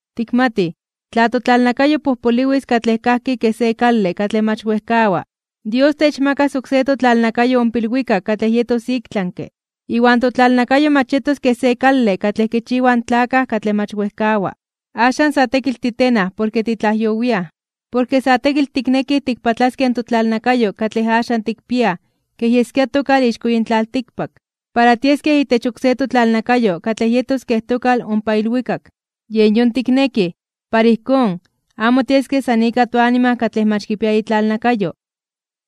Tikmatij, tla totlalnakayo pojpoliwis katlej kajki kej se kale katlej mach wejkawa, Dios techmakas oksé totlalnakayo ompa ilwikak katlej yetos iktlanke (ik tlami), iwan totlalnakayo mach yetos kej se kale katlej kichiwaj in tlakaj katlej mach wejkawa. Axan sa tekitl titenaj porke titlajyowiaj, porke sa tekitl tiknekij tikpatlaskej totlalnakayo katlej axan tikpiaj kej yeskia tokal ixko yin tlaltikpak, para tiaskej itech oksé totlalnakayo katlej yetos kej tokal ompa ilwikak. Yen yon tiknekij, para ijkón, amo tieskej san ika toanima katlej mach kipia itlalnakayo,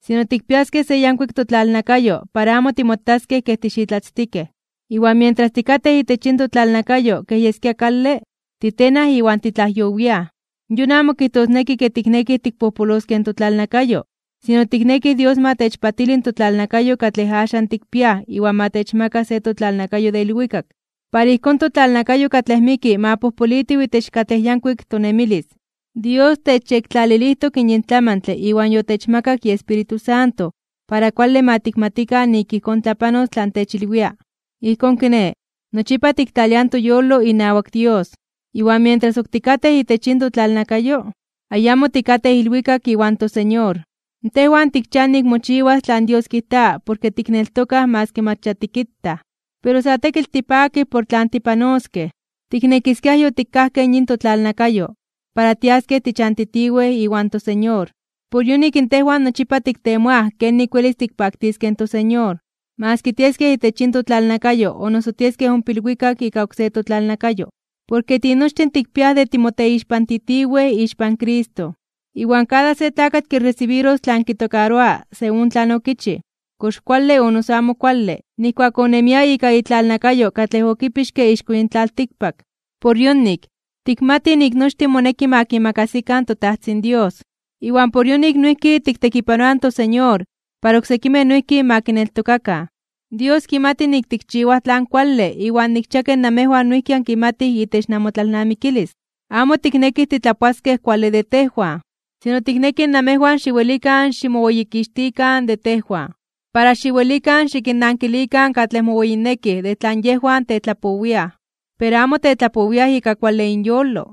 sino tikpiaskej se yankuik totlalnakayo para amo timotaskej kej tixitlatztikej. Iwan mientras tikatej itech yin totlalnakayo kej yeskia kale, titenaj iwan titlajyowiaj. Yon amo kijtosneki ke tiknekij tikpojpoloskej in totlalnakayo, sino tiknekij Dios ma techpatili totlalnakayo katlej axan tikpiaj iwan ma techmaka se totlalnakayo de ilwikak, para ijkón totlalnakayo katlej miki ma pojpolitiw itech katlej yankuik tonemilis. Dios techyektlalilijtok yin tlamantle iwan yotechmakak iEspíritu Santo para kuale ma tikmatikan nik ijkón tlapanos tlan techilwia. Ijkón kiné, nochipa tiktlaliaj toyolo inawak Dios, iwan mientras ok tikatej itech yin totlalnakayo, ayamo tikatej ilwikak iwan toSeñor. Tejwan tikchiaj nik mochiwas tlan Dios kijta porke tikneltokaj maski mach ya tikitaj. Pero sa tekitl tipakij por tlan tipanoskej, tiknekiskiaj yotikajkej yin totlalnakayo, para tiaskej tichantitiwej iwan toSeñor. Por yonik tejwan nochipa tiktemoaj kenik welis tikpaktiskej in toSeñor, maski tieskej itech yin totlalnakayo o noso tieskej ompa ilwikak ika oksé totlalnakayo. Porke tinochtin tikpiaj de timoteixpantitiwej ixpan Cristo, iwan kada se tlakatl kiresibiros tlan kitokaroa según tlan okichij, kox kuale o noso amo kuale, nijkuak onemia ika itlalnakayo katlej okipixke ixko yin tlaltikpak. Por yonik, tikmatij nik nochtin moneki ma kimakasikan toTajtzin Dios. Iwan por yonik noijki tiktekipanoaj in toSeñor para oksekimej noijki ma kineltokakan. Dios kimati nik tikchiwaj tlan kuale iwan nikchia ke namejwan noijki ankimatij itech namotlalnamikilis. Amo tiknekij titlapoaskej kuale de tejwan, sino tiknekij namejwan xiwelikan ximoweyikixtikan de tejwan, para xiwelikan xikinnankilikan katlej moweyinekij de tlan yejwan tetlapowiaj, pero amo tetlapowiaj ika kuale inyolo.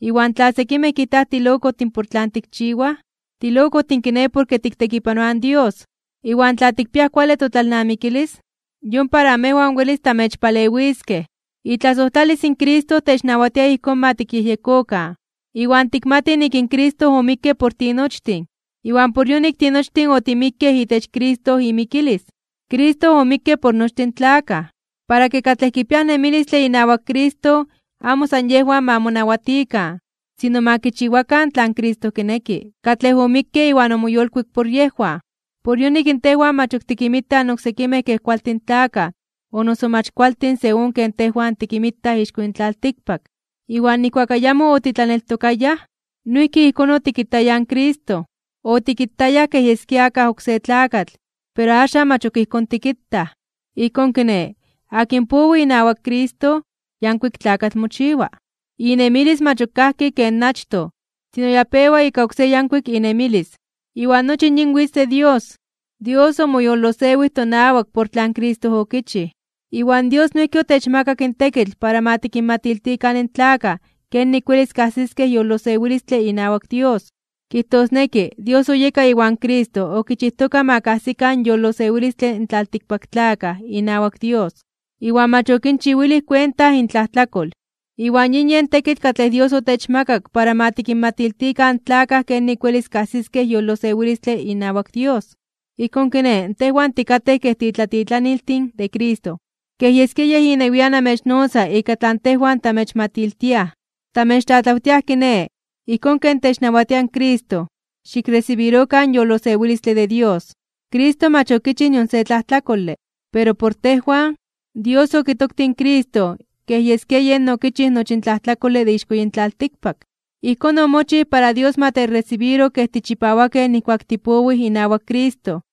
Iwan tla sekimej kijtaj tilokojtin por tlan tikchiwaj, tilokojtin kiné porke tiktekipanoaj in Dios. Iwan tla tikpiaj kuale totlalnamikilis, yon para amejwan welis tamechpalewiskej. Itlasojtlalis in Cristo technawatia ijkón ma tikyejyekokan, iwan tikmatij nik in Cristo omikke por tinochtin, iwan por yonik tinochtin otimikkej itech Cristo imikilis. Cristo omikke por nochtin in tlakaj, para ke katlej kipiaj nemilistle inawak Cristo amo san yejwan ma monawatikan, sino ma kichiwakan tlan Cristo kineki, katlej omikke iwan omoyolkuik por yejwan. Por yonik tejwan mach ok tikinmitaj in oksekimej kej kualtin tlakaj o noso mach kualtin según ken tejwan tikinmitaj ixko yin tlaltikpak. Iwan nijkuak ayamo otitlaneltokayaj, noijki ijkón otikitayaj in Cristo, otikitayaj kej yeskia akaj oksé tlakatl, pero axan mach ok ijkón tikitaj. Ijkón kiné, akin powi inawak Cristo, yankuik tlakatl mochiwa. Inemilis mach ok kajki ken achtoj, sino ya pewa ika oksé yankuik inemilis. Iwan nochi yin witz de Dios. Dios omoyolosewij tonawak por tlan Cristo okichij. Iwan Dios noijki otechmakak in tekitl para ma tikinmatiltikan in tlakaj kenik welis kajsiskej yolosewilistle inawak Dios. Kijtosneki, Dios oyeka iwan Cristo okichijtoka ma kajsikan yolosewilistle in tlaltikpaktlakaj inawak Dios, iwan mach okinchiwilij kuenta intlajtlakol. Iwan yin yen tekitl katlej Dios otechmakak para ma tikinmatiltikan in tlakaj kenik welis kajsiskej yolosewilistle inawak Dios. Ijkón kiné, tejwan tikatej kej titlatitlaniltin de Cristo. Kej yeskia Yej inewian amechnotza ika tlan tejwan tamechmatiltiaj. Tamechtlatlawtiaj kiné, ijkón ken technawatia Cristo: xikresibirokan in yolosewilistle de Dios. Cristo mach okichij nion se tlajtlakole. Pero por tejwan, Dios okitoktij in Cristo kej yeskia yen okichij nochi in tlajtlakole de ixko yin tlaltikpak. Ijkón omochij para Dios ma techresibiro kej tichipawakej nijkuak tipowij inawak Cristo.